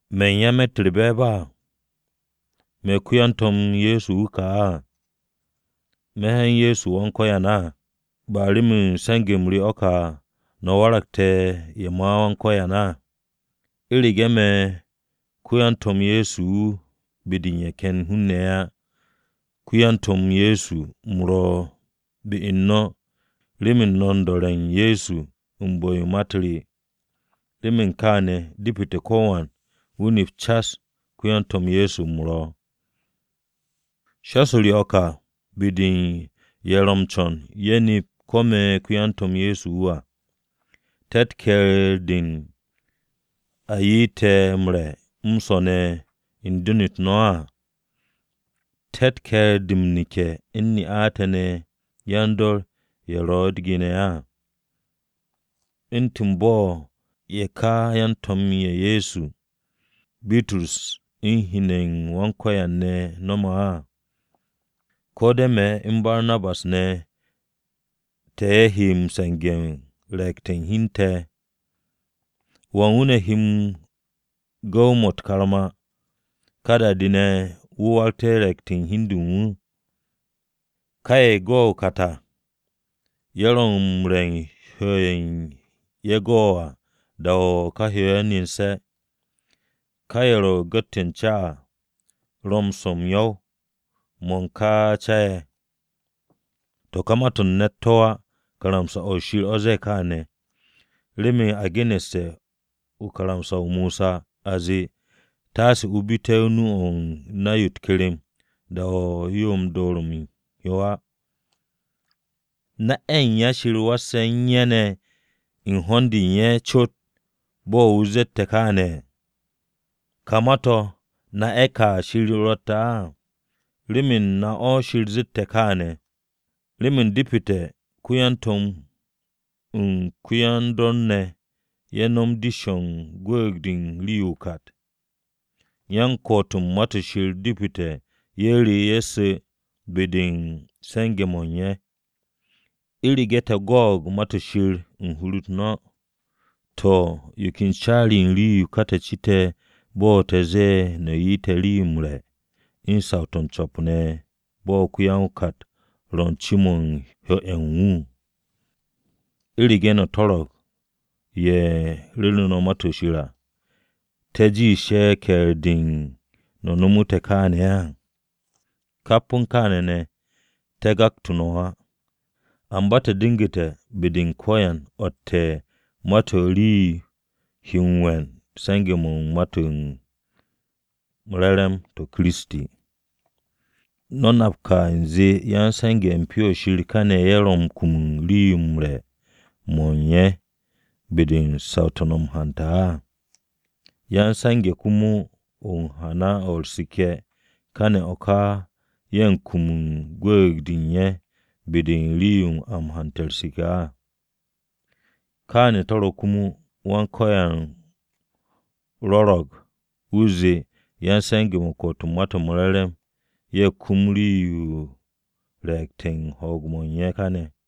¿Me̱ u̱n ya me̱tt u̱r-be̱e̱b á? ¿Me̱ ko-yan-To̱m Ye̱so wu̱ ka á? ¿Me̱ hyan o̱ Ye̱so Wan-Ko̱yan á. Ba remen se̱nge̱-m re o̱ ka no̱ waragte̱ ye̱ ma Wan-Ko̱yan? U̱rege̱ me̱ ko-yan-To̱m Ye̱so wu̱ be-de u̱n ye̱ ken hun-ne̱ á, ko-yan-To̱m Ye̱so u̱m ro̱ be u̱n no̱ remen no̱ u̱n do̱re̱ Wan-Ko̱yan u̱n bu̱-yo ma-u̱t re. Remen kaane̱, depete̱ ko̱wan wu̱ nep cas ko-yan-To̱m Ye̱so wu̱ u̱m ro̱. Shas-o re o̱ ka be-de u̱n ye̱ ro̱ m-co̱n ye̱ nep ko̱ me̱ ko-yan-To̱m Ye̱so wu̱ à. ¿Te̱tt ke̱e̱r-de u̱n a ye'et te̱ m-re̱ m-swo̱ ne̱ u̱n den-u̱t no̱ á? ¿Te̱tt ke̱e̱r-de m-neke̱ u̱n ne'a te̱ ne̱ yan-dor ye̱ ro̱ u̱t-ge ne̱ à, u̱ntu̱n bo̱ ye̱ ka yan-To̱m-ye̱ Ye̱so ye̱, Bitrus u̱n hen-ne̱ Wan-Ko̱yan ne̱ no̱me̱ á? ¿Ko̱ de̱ me̱ u̱n Barnabas ne̱, te̱ ye̱ he se̱nge̱-mo̱ u̱n re̱e̱gte̱ u̱n hi u̱n te̱? ¿Wan wu̱ ne̱ he gu̱w-mo̱ u̱t-karma, ká da-de ne̱ wu̱ waragte̱ re̱e̱gte̱ u̱n hi u̱n de u̱n wu̱? Ka ye̱ go o-kat à, ro̱ m-re̱ u̱n hyo-ye̱ ye̱ go à da-o̱ ka hyo-ye̱ nene̱. Ka ye̱ ro̱ gu̱t-de u̱n ca à, ro̱ m-swo̱ m-yo̱w mo̱ u̱n ka ca-ye̱. To̱ ka ma-to̱ u̱n ne̱t to̱ á. Karamsa-o̱ o̱ Shir o̱ zee kaane̱. Remen a geneste̱ u̱n karamsa-o Mosa a zee, “Taase o bite̱ nu-o̱ u̱n na-yo u̱t-kerem da-o̱ yo door-mo̱ u̱n hyo á.” ¿Na-ye̱ u̱n ya Shir he m-was u̱n ye̱ ne̱ u̱n ho̱n-de u̱n ye̱ cot bo̱ wu̱ ze̱e̱ kaane̱? ¿Ká ma-to̱ na ye̱ ka Shir ro̱tte̱ á? Rem na o̱ Shir zette̱ kaane̱. Remen depete̱ ko-ya-to̱m u̱n ko-ya-m-dor ne̱ ye̱ nom dish-o̱ u̱n gwu̱u̱g-de u̱n rii-yo o-kat. Yan-ko̱'o̱t u̱n Ma-to̱ Shir depete̱ ye̱ re ye̱ su̱ be-de u̱n se̱nge̱-mo̱ u̱n ye̱. U̱rege̱ te̱ go̱o̱g Ma-to̱ Shir u̱n hur-u̱r no̱, to̱, ¿yo ken caari-yo u̱n rii-yo ka te̱ cite̱ bo̱ te̱ zee no̱ 'ye te̱ rii-yo m-re̱ u̱n saw-to̱ m-co̱p ne̱ bo̱ ko-ya-o-kat ro̱ ce-mo̱ u̱n hyo-ye̱ u̱n wu̱? U̱rege̱ no̱ to̱ro̱g ye̱ ru̱ru̱ no̱ Ma-to̱ Shir à, ¿te̱ jiish ye̱ u̱n ke̱e̱r-de u̱n no̱ nomotu̱ te̱ kaane̱ á? Kap u̱n kaane̱ ne̱, te̱ gaktu̱ no̱ á. Amba te̱ du̱ngu̱te̱ be-de u̱n ko̱yan o̱tte̱ ma-to̱ u̱n rii-yo he we̱n u̱n se̱nge̱-mo̱ u̱n Ma-to̱ m-Re̱re̱m to̱ ma Kiristi à. ¿No̱ nap ka u̱nze ya-m-se̱nge̱ u̱n Pyo-o̱ Shir káne̱ ye̱ he kum u̱n rii-yo u̱n re̱-mo̱ u̱n ye̱ be-de u̱n saw-to̱ a m-hante̱ á? ¿Ya-m-se̱nge̱ komo u̱n o-hana o̱ u̱r-seke̱, káne̱ o̱ ka ye̱ he kum u̱n gwu̱u̱g-de u̱n ye̱ be-de u̱n rii-yo a hante̱ u̱r-seke̱ á? Kaane̱ to̱ ro̱ komo, Wan-Ko̱yan rwo̱ro̱g wu̱ zee yan-se̱nge̱-mo̱ u̱n ko̱'o̱t u̱n Ma-to̱ m-Re̱re̱m ye̱ kum rii-yo u̱n re̱e̱gte̱ u̱n ho̱o̱g-mo̱ u̱n ye̱ káne̱.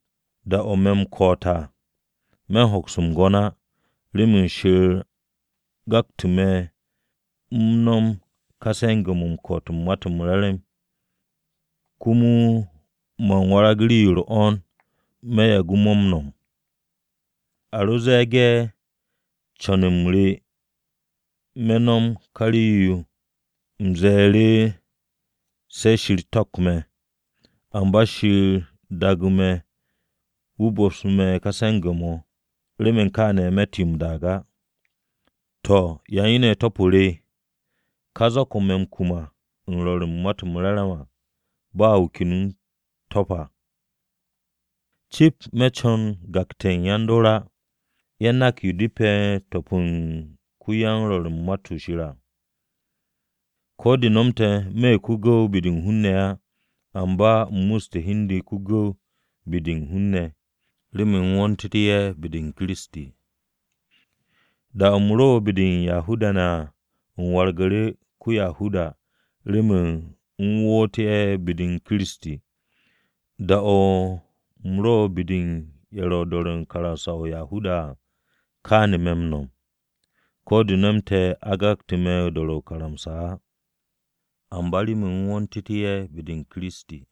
Da-o̱ me̱ m-ko̱'o̱t à, me̱ u̱n hoks m-gwo̱n á, remen Shir gaktu̱ me̱ m-no̱m ká se̱nge̱-mo̱ u̱n ko̱'o̱t u̱n Ma-to̱ m-Re̱re̱m. Komo man warag rii-yo u̱r-'wo̱n me̱ yagu̱ mo̱ m-no̱m! A ro ze̱e̱ge̱ u̱n co̱n-m re me̱ m-no̱m u̱n ka rii-yo, u̱m ze̱e̱ru̱ se̱ Shir to̱pk me̱. Amba remen Shir daagu̱ me̱ wu̱ bo̱psu̱ me̱ ka se̱nge̱-mo̱, remen kaane̱ me̱tt yo m-daag á. To̱, ¿ya u̱n yo ne̱ ro̱ top-o re? Ka zak-o̱ me̱ m-kum be-de u̱n rwo̱r u̱n Ma-to̱ m-Re̱re̱m à ba wu̱ ken wu̱ u̱n to̱p á. Cip me̱ co̱n m-gakte̱ yan-dor á, ye̱ nak yo depe̱ m-to̱p u̱n ko-yan-ko̱'o̱t u̱n Ma-to̱ Shir à. Ko̱ de̱ nomte̱ me̱ ko-gu̱w be-de u̱n hun-ne̱ á, amba u̱m muste̱ hi u̱n de ko-gu̱w be-de u̱n hun-ne̱, remen u̱m wo̱ntu̱tú̱ ye̱ be-u̱r Kiristi. Da-o̱ me̱ ro be-de u̱n Yahuda-ne̱, u̱m wargu̱ru̱ u̱ntu̱n ko-Yahuda remen u̱m wo̱ntu̱tú̱ ye̱ be-u̱r Kiristi. Da-o̱ me̱ ro be-de u̱n ye̱ ro̱ m-do̱re̱ u̱n karamsa-o̱ u̱n Yahuda-ne̱ à, kaane̱ me̱ m-no̱m, (ko̱ de̱ nomte̱ a gakte̱ me̱ u̱n dor-o̱ ka karamsa-o̱ á), amba remen u̱m wo̱ntu̱tú̱ ye̱ be-u̱r Kiristi.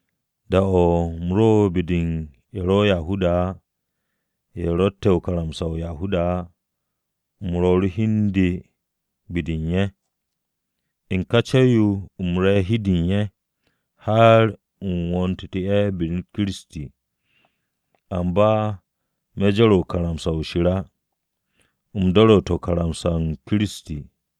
Da-o̱ me̱ ro be-de u̱n ye̱ ro̱ Yahuda-ne̱ á, ye̱ ro̱tte̱ karamsa-o̱ u̱n Yahuda-ne̱ á u̱m rwo̱'u̱ru̱ hi u̱n de be-de u̱n ye̱. U̱n ka co̱w-yo u̱m re̱ hi-de u̱n ye̱, har u̱m wo̱ntu̱té̱ ye̱ be-de u̱n Kiristi. Amba me̱ jore̱ karamsa-o̱ Shir á. U̱m do̱ru̱te̱ karamsa-o Kiristi.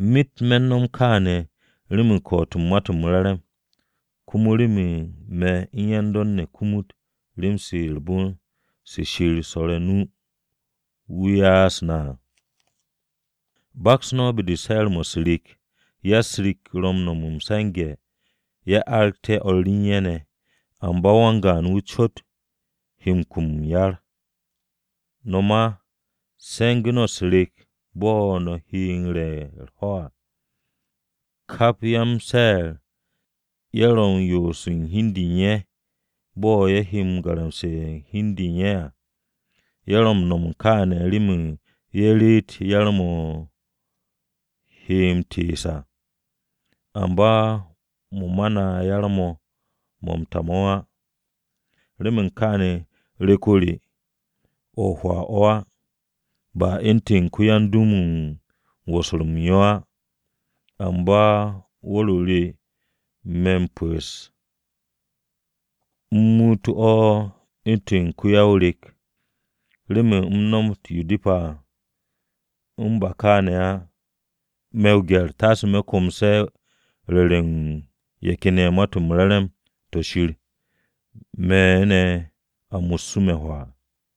Myet me̱ u̱n no̱m kaane̱ remen ko̱'o̱t u̱n Ma-to̱ m-Re̱re̱m, komo remen me̱ u̱n yan-dor ne̱ kumut rem-se u̱r-bon se Shir su̱rte̱ o-nu wu̱ ya'as na à. ¿Ashi no̱ baks be-de u̱n se̱'e̱r-mo̱ u̱s-rek, ya-u̱s-rek ro̱ m-no̱m m-se̱nge̱ ye̱ aragte̱ o̱r u̱n ye̱ ne̱, amba wan-gaan wu̱ cot ro̱ u̱n kum m-yar? No̱ ma se̱ngu̱ no̱ u̱s-rek bo̱ no̱ he re̱ u̱r-ho̱ à. Kap ya-m-se̱'e̱r, ye̱ ro̱ u̱n yoose̱ u̱n hi u̱n de u̱n ye̱ bo̱ ye̱ he garamse̱ u̱n hi u̱n de u̱n ye̱ à. Ye̱ ro̱ m-no̱m kaane̱ remen ye̱ reet m-yar mo̱ he m-tees à, amba mo̱ ma na yar-mo̱ mo̱ m-ta mo̱ á. Remen kaane̱ re̱k-o re o̱ o-hwaa o̱ á. Ba u̱ntu̱n ko-ya-m-dum wu̱ ro̱ m-wosor m-yo á. Amba wu̱r-o re o̱ me̱ m-pu̱'u̱s, u̱m muutu̱ o̱ u̱ntu̱n o̱ u̱n ko-ya-o-rek, remen o̱ nomot yo depe̱ à. U̱n ba kaane̱ á, me̱ o-gye̱r taase me̱ komse̱ ru̱re̱ u̱n ye̱ ken ye̱ Ma-to̱ m-Re̱re̱m to̱ Shir me̱ ne̱ a mussu̱ me̱ hwaa.